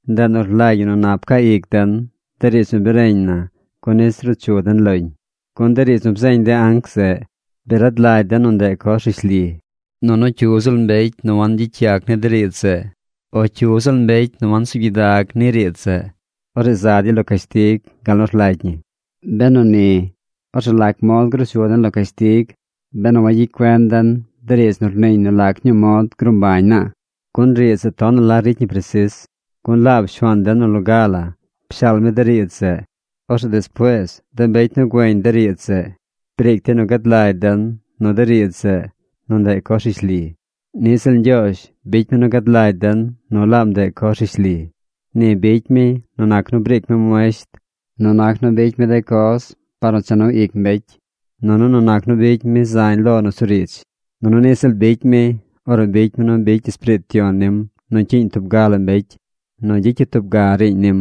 Ndeꞌ nu rlagy ñi nu nap caa ic den de riidz nu bi reñ na gun nis ruu chu den loñ. Gun de riidz nu bzeeñ de anc zeꞌ, bi rad lagy den nu ndeꞌ coz rishli. Nunu cyu ziꞌl mbecy nu wangyicy yac ni de riidz zeꞌ, o cyu ziꞌl mbecy nu wansuub gyidag ni riidz zeꞌ, orzeꞌ za dey lo cashtig gal nu rlagy ñi. Benu ni, orzeꞌ ¿lac mod gruu chu den lo cashtig benu wayicy cuen den de riidz nu rniiñ nu lac ñuu mod gruu mbañ naa? Gun riidz zeꞌ tonaꞌ la ricy ñi presis. Gun laab Shuaan den nu loga la pshaal mi de riidz zeꞌ. Orzeꞌ despuees de mbecy nu gueñ de riidz zeꞌ briic dey nu gad lagy den nu de riidz zeꞌ, nu ndeꞌ coz rishli. Niꞌ ziꞌl Ñgyoozh bicy mi nu gad lagy den nu laab ndeꞌ coz rishli. Ni bicy mi nu nac nu briic mi muesht, nu nac nu bicy mi de coz par nu cha nu ic mbecy, nunu nu nac nu bicy mi zañ lo nusuriidz. Nunu niꞌ ziꞌl bicy mi ornu bicy mi nu bicy Espiriit Yon nim nu cyiiñ tub ga la mbecy nu gyicy yu tub ga riiñ nim.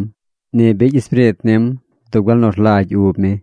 Ni bicy Espiriit nim dub gal nu rlagy ub mi.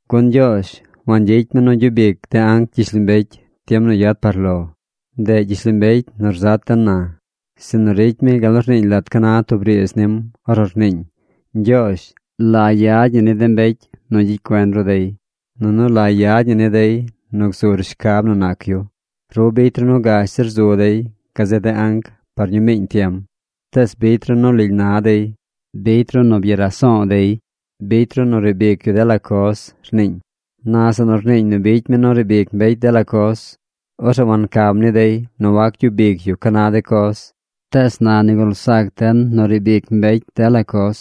Gun Ñgyoozh wangyicy mi nu gyub ic de anc gyishlombecy tiem nu yad par lo. Ndeꞌ gyishlombecy nu rzat den na. Sinu ricy mi gal nu rniiñ lat ca na tub riidz nim ornu rniiñ: Ñgyoozh, ¿la yad ñi ni de mbecy nu gyicy cuen ru dey? Nunu ¿La yad ñi ni dey nu gzur shcab nu nac yu? Ru bicy ru nu gash zir zu dey gazeꞌ de anc par ñuu miiñ tiem. Tees bicy ru nu lily na dey. Bicy ru nu byaraso̱o̱ dey. Bicy ru nu riib ic yu dela coz, rniiñ. Na zeꞌ nu rniiñ nu bicy mi nu riib ic mbecy dela coz, orzeꞌ wancam ni dey nu wac gyub ic yu ca na de coz. Tees na nigul zac den nu riib ic mbecy dela coz.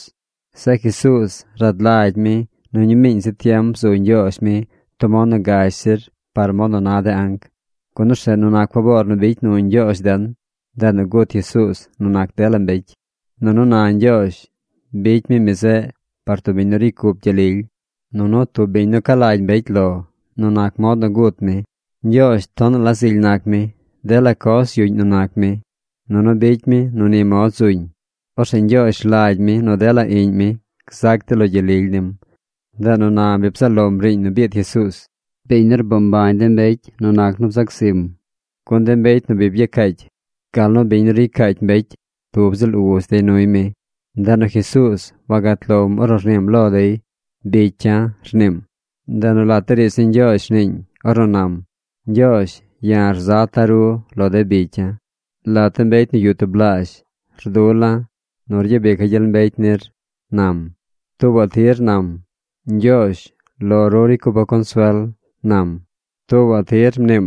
Zeꞌ Jesuuz, rad lagy mi nu ñuu miiñ zi tiem bzu Ñgyoozh mi tub mod nu gash zir par mod nu na de anc, gun orzeꞌ nu nac faboor nu bicy nu Ñgyoozh den, ndeꞌ nu gut Jesuuz nu nac dela mbecy. Nunu na Ñgyoozh bicy mi mi zeꞌ par tub biñ nu ricy cup gyel lily, nunu tub biñ nu ca lagy mbecy lo nu nac mod nu gut mi. Ñgyoozh tonaꞌ la zily nac mi. Dela coz yuꞌñ nu nac mi. Nunu bicy mi nu ni mod zuñ. Orzeꞌ Ñgyoozh rlagy mi nu dela iꞌñ mi gzac dey lo gyel lily nim. Ndeꞌ nu na bi bzaꞌ lom riiñ nu biid Jesuuz, biñ nu rboo mbañ de mbecy nu nac nu bzac zim. Gun de mbecy nu bi byacaacy, gal nu biñ nu ricy caacy mbecy, tub ziꞌl Uz dey nuy mi. Ndeꞌ nu Jesuuz wagat lom ornu rniim lo dey: “Bicya̱”, rniim. Ndeꞌ nu lat de riidz ni Ñgyoozh rniiñ ornu nam: Ñgyoozh, ya̱ rzata̱ ru lo de bicya̱. Lat de mbecy nu yuꞌ tublaazh rdula̱ nu ryabica̱ gyel mbecy nir, nam. Tuubaꞌ tir nam: Ñgyoozh, lo ru ricy cupa̱ consuel, nam. Tuubaꞌ tir mniim: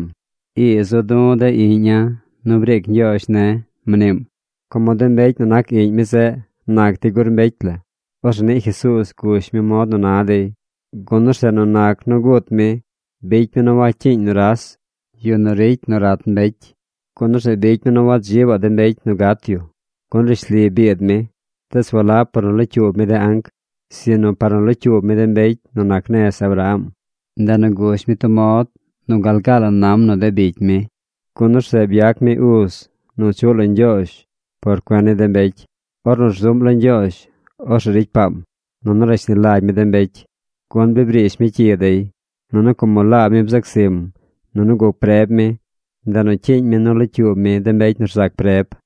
Ii zu̱ du̱ de iꞌña̱ nu briic Ñgyoozh ne̱, mniim. Como de mbecy nu nac iꞌñ mi zeꞌ nac dey gur mbecy la, orzeꞌ niꞌ Jesuuz gush mi mod nu na dey, gun orzeꞌ nu nac nu gut mi, bicy mi nu wacyiiñ nuras, yu nu ricy nu rat mbecy. Gun orzeꞌ bicy mi nu wadzibaꞌ de mbecy nu gat yu. Gun rishli biid mi, tees walab par nu locyuub mi de anc, sinu par nu locyuub mi de mbecy nu nac nez Abraham. Ndeꞌ nu gush mi tub mod nu gal gaa la nam nu de bicy mi. Gun orzeꞌ byac mi uz nu chuꞌ lo Ñgyoozh par cuen ni de mbecy. Ornu rzuꞌm lo Ñgyoozh, orzeꞌ ricy paam, nunu rashni lagy mi de mbecy, gun bi briish mi cyi dey. Nunu como laab mi bzac zim, nunu guc preb mi, ndeꞌ nu cyiiñ mi nu locyuub mi de mbecy nu rzac preb.